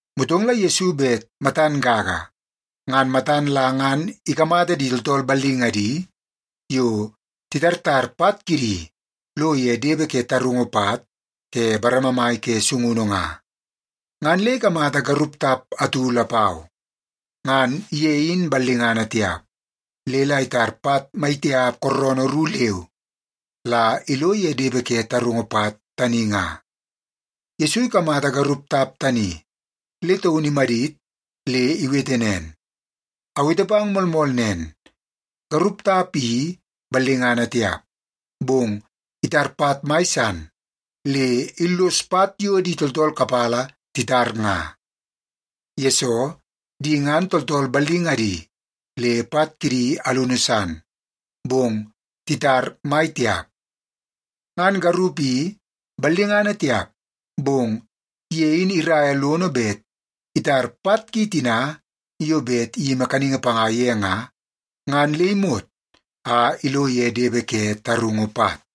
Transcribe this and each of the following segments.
Motong la Yesu bet matan gaga a matan la ngan ikamata di tooltool ballingadi yo titartar pat kidi lo ye depe ke tarungu pat ke bareme mai ke sungunu nga, ngan le ikamata garup tap atu lapau. Ngan ye in ballingana tiap, le la itar pat maitiap kooroonoo ru leu la ilo ye depe ke tarungu pat tani nga. Yesu ikamata garup tap tani, le taun imadit le iwete nen, “Awete pang moolmool nen, garup tap i ballingana tiap, bong itar pat mai san le illos pat yo di tooltool kapala titar nga, yesoo, di ngan tooltool ballingadi le pat kidi alunu san, bong titar mai tiap. Ngan garup i ballingana tiap, bong ye in iraia lono bet itar pat ki tina yo bet iyimi kaningi panga ye nga, ngan le imot a ilo ye depe ke tarungu pat.”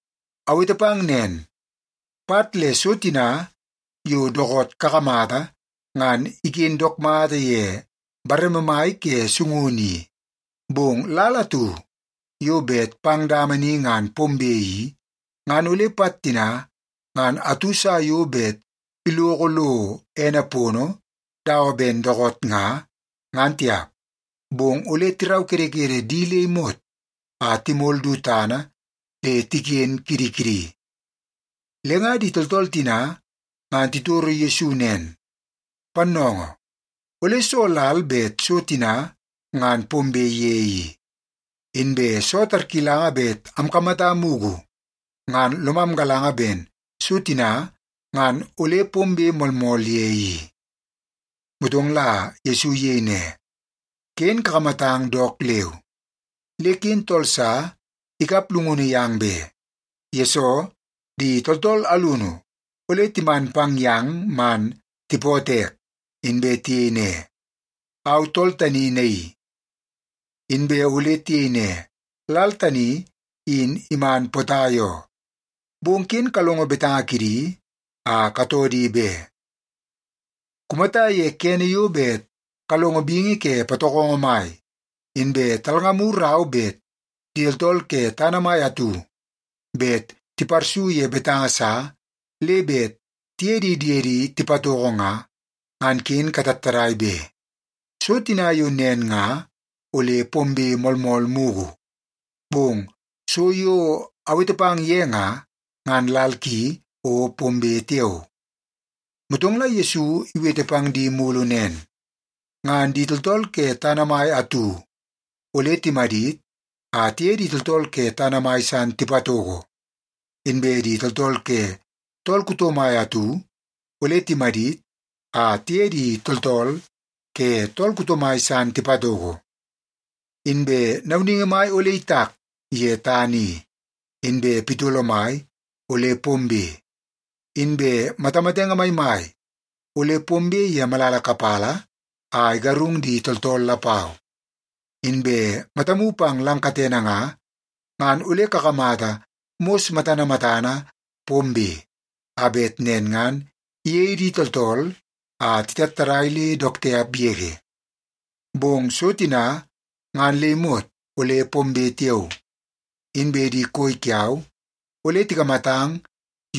“Awete pang nen, pat le so tina yo dookoot kakamata ngan iken dook mata ye bareme mai ke sungunu i, bong lal atu yo bet pang dama ni ngan pombe i, ngan ole pat tina ngan atu sa yo bet iloko lo ene pono dawa ben dookoot nga, ngan tiap. Bong ole tiraukedekede di le imot a timol du tana le tiken kidi kidi.” Le nga di tooltool tina ngan titoro Yesu nen, “Pannoongoo, ole soo lal bet so tina ngan pombe ye i? Inbe soo tarkilanga bet amkamata mugu, ngan lomam galanga ben so tina ngan ole pombe moolmool ye i.” Motong la Yesu iyei ne, “Ken kakamatang dook leu, le ken tool sa ikap llungunu yang be. Yesoo, di tooltool alunu ole timan pang yang man tipootoo ek, inbe tiyei ne, ‘Au tool tani naii!’ Inbe ole tiyei ne, ‘Lal tani in iman potai oo.’ Bong ken kalongo betanga kidi a katoo di be. Kumata ye kene yo bet kalongo bingi ke patokongo mai, inbe talngamu rau bet di tooltool ke tana mai atu bet tiparsu ye betanga sa le bet tiye di diedi tipatoko nga, ngan ken katattadai be! So tina yo nen nga ole pombe moolmool mugu, bong so yo awete pang ye nga, ngan lal ki o pombe tiao.” Motong la Yesu iwete pang di mulu nen, “Ngan di tooltool ke tana mai atu ole timadit a tiye di tooltool ke tana mai san tipatoko. Inbe di tooltool ke tool kuto mai atu ole timadit a tiye di tooltool ke tool kuto mai san tipatoko. Inbe nauningi mai ole itak ye tana i, inbe pitolo mai ole pombe, inbe matamatenge maimai ole pombe ye malala kapala a igarung di tooltool lapau. Inbe matamu pang lang katene nga, ngan ole kakamata mos matana matana pombe, a bet nen ngan iyei di tooltool a titattadai le dook tiap yege. “Bong so tina ngan le imot ole pombe tiao, inbe di koi kiau ole tikamatang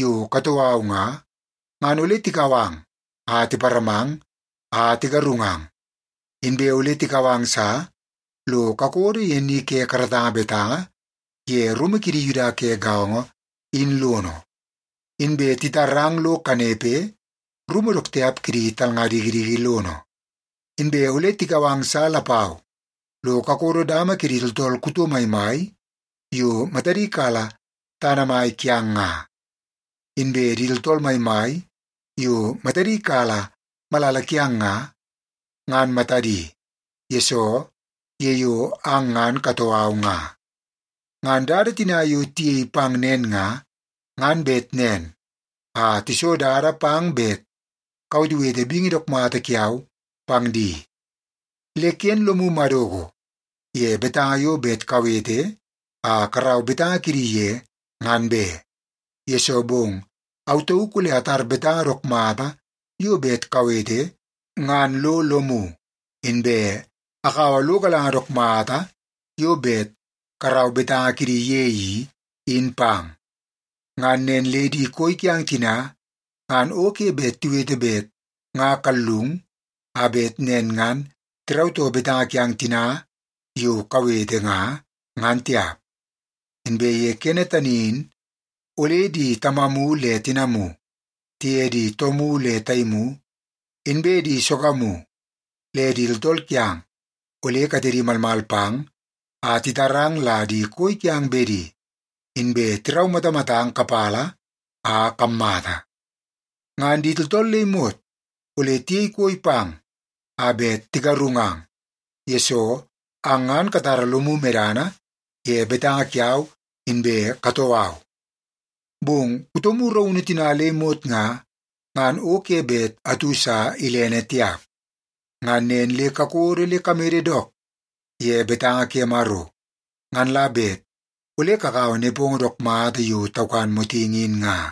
yo katoo au nga, ngan ole tikau ang a tiparamang a tigarungang. Inbe ole tikau ang sa lo kakodo ye ni ke karatanga betanga ye rumu kidi Yuda ke gaongo in lono, inbe titarang lo kanepe rumu dook tiap kidi talnga dikidiki lono. Inbe ole tikau ang sa lapau lo kakodo dama kidi tooltool kuto maimai yo matadi kala tana mai kiang nga, inbe di tooltool maimai yo matadi kala malala kiang nga, ngan matadi, yesoo ye yo ang ngan katoo au nga. Ngan dada tina yo tiyei pang nen nga, ngan bet nen a tiso dada pang bet kawetewete bingi dook mata kiau pang di. Le ken lomu madoko ye betanga yo bet kawete a karau betanga kidi ye, ngan be, yesoo bong au tauk ole atar betanga dook mata yo bet kawete ngan lo lomu, inbe akaua lo galanga dook mata yo bet karau betanga kidi ye i, in pang. Ngan nen le di koi kiang tina ngan o ke bet tiwete bet nga kallung, a bet nen ngan tirautoo betanga kiang tina yo kawete nga, ngan tiap. Inbe ye kene tani in, ole di tamamu le tinamu, tiye di toomu le taimu, inbe di sogamu le di tooltool kiang ole katedi malmal pang a titarang la di koi kiang bedi, inbe tiraumatamatang kapala a kammata. Ngan di tooltool le imot ole tiyei koi pang a bet tigarungang, yesoo ang ngan katara lomu medana ye betanga kiau inbe katoo au. Bong kutomu raunu tina le imot nga, ngan o ke bet atu sa ilene tiap. Ngan nen le kakodo le kamede dook ye betanga ke Maro, ngan la bet ole kakaua nepongo dook mata yo taukan motingi in nga.”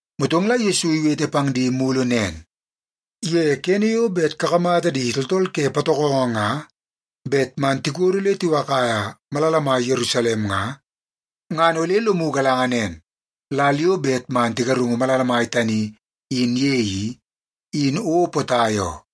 Motong la Yesu iwete pang di mulu nen, “Ye kene yo bet kakamata di tooltool ke patokongo nga bet man tikodo le tiwakaia malala mai Yerusalem nga, ngan ole lomu galanga nen, lal yo bet man tigarungu malala mai tani in ye i, in o potai oo.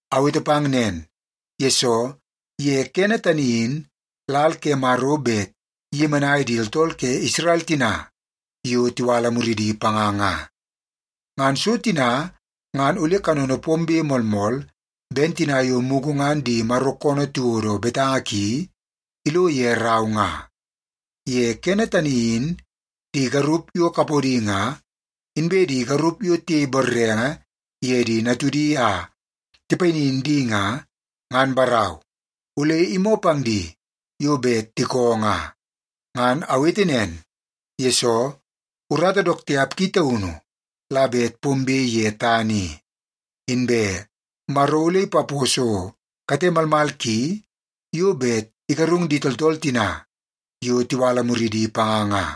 Awete pang nen, yesoo ye kene tani in lal ke Maro bet iyemenai di tooltool ke Isrel tina yo tiwala muridi panga nga. Ngan so tina ngan ole kanono pombe moolmool ben tina yo mugu ngan di Maro koonoo tiwodo betanga ki ilo ye rau nga. Ye kene tani in di garup yo kapodi nga, inbe di garup yo tiyei borrenge ye di natudi a tipayinin di nga, ngan barau, ole imoo pang di yo bet tikoo nga. Ngan awete nen, yesoo urata dook tiap ki taunu la bet pombe ye tana i, inbe Maro ole ipaposo kate malmal ki yo bet igarung di tooltool tina yo tiwala muridi panga nga.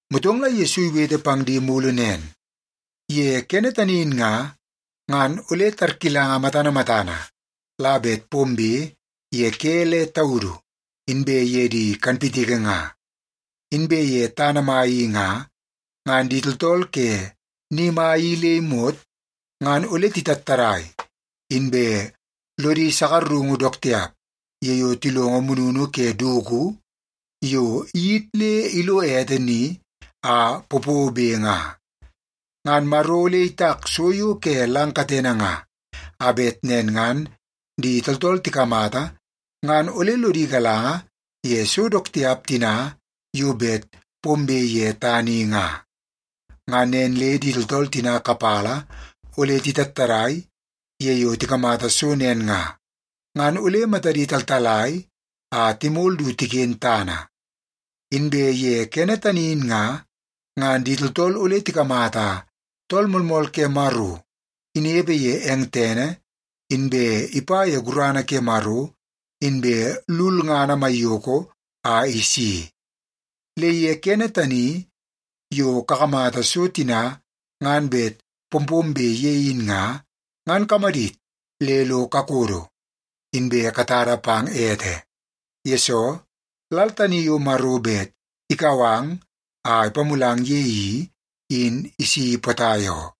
Motong la Yesu iwete pang di mulu nen, “Ye kene tani in nga, ngan ole tarkilanga matana matana la bet pombe ye ke le taudu inbe ye di kanpitiki nga. Inbe ye tana mai i nga, ngan di tooltool ke ni mai i le imot ngan ole titattadai inbe lodi sakarungu dook tiap ye yo tilongo mununu ke dugu yo iyit le ilo ete ni a popobe nga. Ngan Maro ole itak so yo ke lang katene nga, a bet nen ngan di tooltool tikamata ngan ole lodi galanga ye so dook tiap tina yo bet pombe ye tana i nga. Ngan nen le di tooltool tina kapala ole titattadai ye yo tikamata so nen nga, ngan ole matadi taltalai a timol du tiken tana. Inbe ye kene tani in nga, ngan di tooltool ole tikamata Tool Moolmool ke Maro inepe ye eng tene, inbe ipa ye gurana ke Maro inbe lulngana maiyoko a isi. Le ye kene tani yo kakamata so tina ngan bet pompombe ye in nga, ngan kamadit le lo kakodo, inbe katada pang ete. Yesoo, lal tani yo Maro bet ikau ang a ipamulang ye i, in isi potai oo.”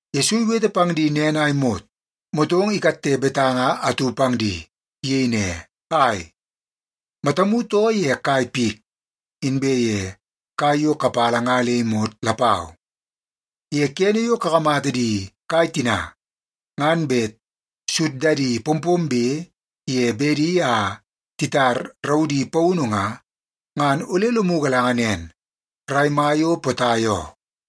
Yesu iwete pang di nen a imot, motong ikatte betanga atu pang di. Iyei ne, “Ai, matamu too ye kai pik, inbe ye kai yo kapala nga le imot lapau. Ye kene yo kakamata di kai tina ngan bet suddadi pompombe ye bedi a titar raudi paunu nga, ngan ole lomu galanga nen, rai mai o potai oo.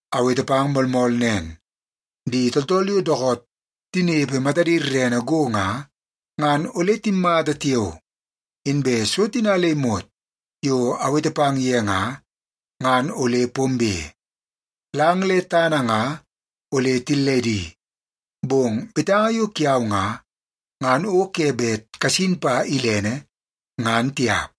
“Awete pang moolmool nen, di tooltool yo dookoot tinepe matadi rerene go nga, ngan ole timmata tiao, inbe so tina le imot yo awete pang ye nga, ngan ole pombe. Lang le tana nga ole tilledi, bong betanga yo kiau nga, ngan o ke bet kasin pa ilene, ngan tiap.”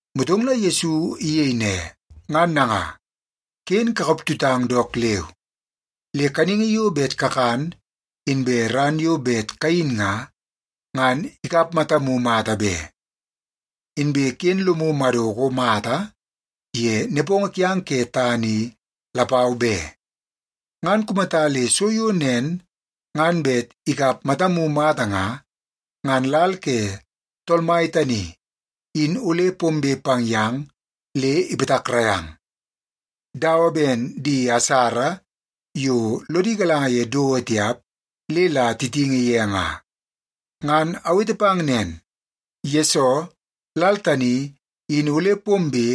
Motong la Yesu iyei ne, “Ngan nanga, ken kakap tutang dook leu. Le kaningi yo bet kakan, inbe ran yo bet kayin nga, ngan ikap matamu mata be. Inbe ken lomu madoko mata ye nepongo kiang ke tana i lapau be. Ngan kumata le so yo nen ngan bet ikap matamu mata nga, ngan lal ke Tool Mai tani in ole pombe pang yang le ipatakrai ang, dawa ben di asara yo lodi galanga ye dowo tiap le la titingi ye nga. Ngan awete pang nen, yesoo lal tani in ole pombe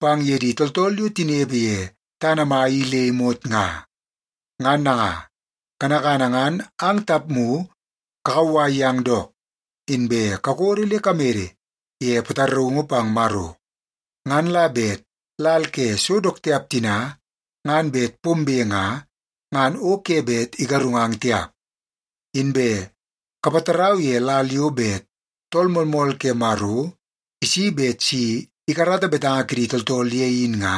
pang ye di tooltool yo tinepe ye tana mai i le imot nga. Ngan nanga, kanakana ngan ang tapmu kakauwai yang dook, inbe kakodo le kamede ye pataraungu pang Maro. Ngan la bet lal ke so dook tiap tina ngan bet pombe nga, ngan o ke bet igarungang tiap. Inbe kapatarau ye lal yo bet Tool Moolmool ke Maro isi bet si ikarata betanga kidi tooltool ye in nga,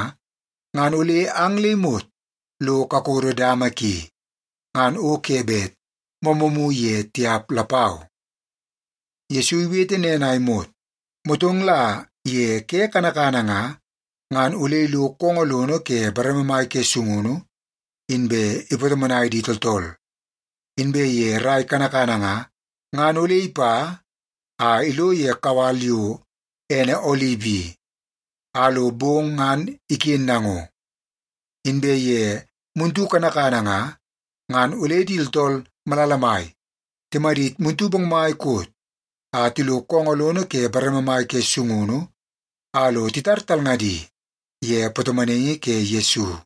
ngan ole ang le imot lo kakodo dama ki, ngan o ke bet moomoomu ye tiap lapau.” Yesu iwete nen a imot, motong la ye ke kanakana nga, ngan ole ilo koongoo lono ke bareme mai ke sungunu, inbe ipatomonai di tooltool. Inbe ye rrai kanakana nga, ngan ole ipa a ilo ye kawal yo ene Olip i, a lo bong ngan iken nango. Inbe ye muntu kanakana nga, ngan ole di tooltool malala mai timadit muntu bongmai koot a tilo koongoo lono ke bareme mai ke sungunu a lo titar talngadi ye patomonaingi ke Yesu.